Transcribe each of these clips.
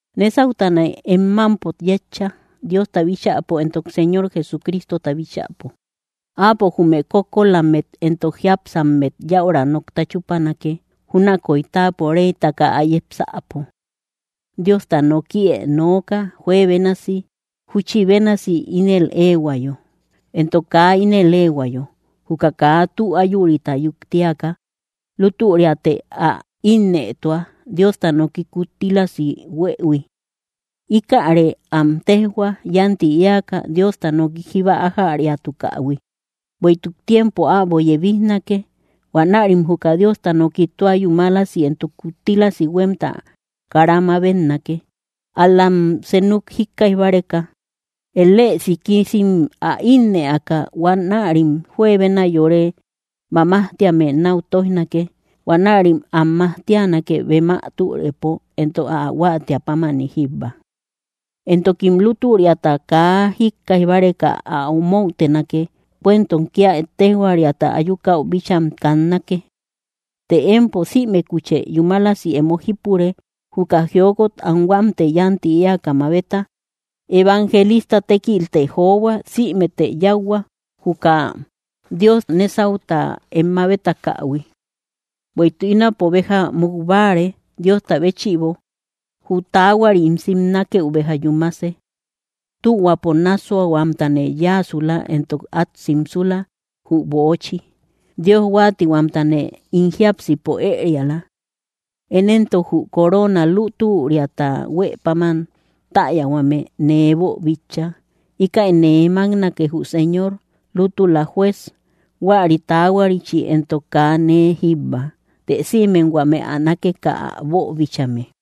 Nésautane em mámpo yétcha, Diosta bíchäpo entok Señor Jesucristota bíchäpo. Áapo jume kókkolammet entok jiápsammet yäura nokta chúpanake, júnakoy táapo reytaka ä yepsäpo. Diosta nokië nooka, juebénasi júchi bénasi ínel éehuayo, entok kaa ínel éehuayo. Juka kaa tü áyurita yuktiaka, lútüriate ä ínnëtua, Diosta noki kuttílasi huëhui. Íkäre am téjhua, yánti éaka, Diosta noki jíba ájäriatukähui. Bueïtuk tiempo äbo yebijnake; huanärim juka Diosta noki tua yúmalasi entok kuttílasi huemta kara mabetnake. Ál‑lam senuk jíkkaij báreka, elësikisim ä ínnëaka, huanärim juebena yore mamajtíame náu tóijnake. Huanärim am majtianake, bem ä türepo entok ä huáatiä pámani jíbba. Entokim lútüriata kaa jíkkaij báreka ä omoutenake, cuentom kia ettejoariata ayukäu bícham kannake. Të empo sïmekuchë yúmalasi emo jípure; juka jiokot anhuamtë yánti éaka mabeta; evangelista tékiltë johua; sïmete yáuhua, juka Dios nésauta em mabetakähui. Bueïtuk ínapo béja muk báare, Diosta béchïbo; jü taahuari ín simnakeu béja yúmase. Tühuapo nássuahuamtane yáasula; entokne át simsula jü böochi; Dios huáatihuamtane ín jiápsipo ëriala. Én éntok, jü coroona lútüriata huë páman täyahuame nee boobíchaïhui. Íkäi nee máknake, jü Señor lútula Juez, huäri taahuarichi. Entok kaa nee jíbba, të sïmem huame ä nákeka ä boobíchaïhuime.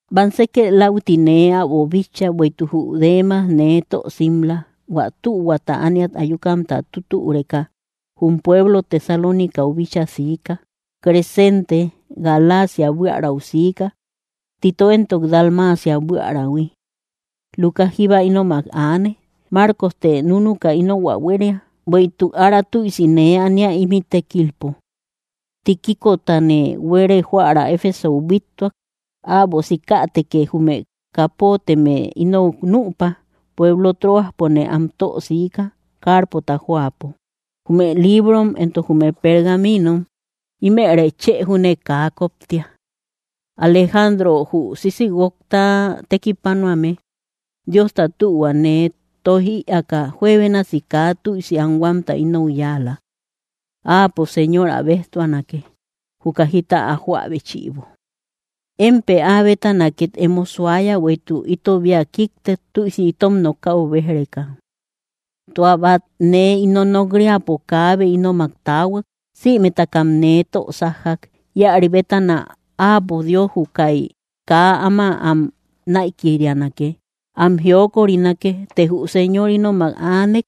Bamsekë läuti nee äbo bitcha. Bueïtuk jü Demas nee tö simla; kaa tühuaata ániat ayukamta tutüreka, jum pueblo Tesalónicau bíchaa siika. Crescente Galacia buiärau siika; Tito éntok Dalmacia buíärähui. Lucas jíba ínomak aane. Marcoste núnuka inou ä huéria, bueïtuk ára tüisi nee ania, ímï tékilpo. Tíquicotane buere joära Efesou bíttuak. Äbo sikätekë jume kapotemë inou nüpa; pueblo Troaspone am tö siika, Carpota jóapo. Jume librom entok jume pergaminom, ímërë chë júne kaa koptia. Alejandro jü sisïguokta tekipanuame, Diosta tühua nee tóij ïaaka, juebénasi kaa tüisi anhuamta inou yáala. Áapo Señor ä béjtuanake, juka jita ä joä béchïbo. Émpë áa bétana két emo suaya, bueïtuk ítobia kíktek, tüisi itom nokäu béj‑reka. Tua bát nee ino nok‑riäpo kaabe ínomak taahuak; sïmetakam nee tö sájjak. Íäri bétana Áapo Dios jukai kaa ama am naïkirianake, am jiokorinake. Të jü Señor ínomak aanek,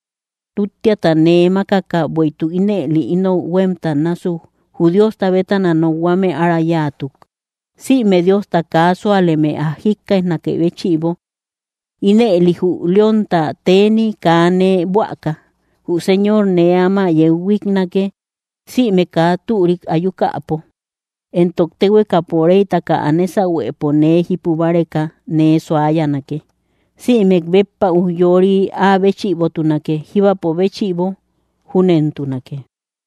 úttiata nee mákaka, bueïtuk ínëli ínou huémta násuk jü Diosta bétana nokhuame ára yáatuk, sïme Diosta kaa súaleme ä jíkkaijnakë béchïbo. Ínëli jü leónta teni kaa nee buäka. Jü Señor nee áma yeu huíknake, sïme kaa türik ayukäpo, entok téhuekapo reytaka ä nésahuepo nee jípu báreka nee suayanake. Sïmek béppa ujyoori áa béchïbotunake jíbapo béchïbo. Júnentunake.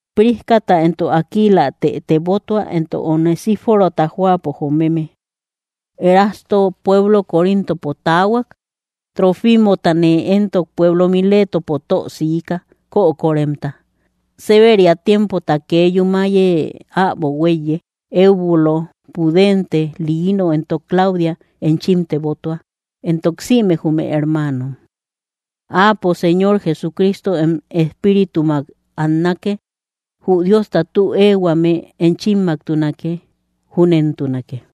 Priscata entok Aquilatë tebotua, entok Onesíforota jóapo jomeme. Erasto pueblo Corintopo taahuak. Trófimotane éntok pueblo Miletopo tö siika, kökoremta. Séberia tiempota kee yúmaye äbo huéiye. Eubulo, Pudente, Lino entok Claudia enchim tebotua, entok sïme jume hermaanom. Áapo Señor Jesucristo em espíritumak annake. Jü Diosta tü éehuame enchimmaktunake. Júnentunake.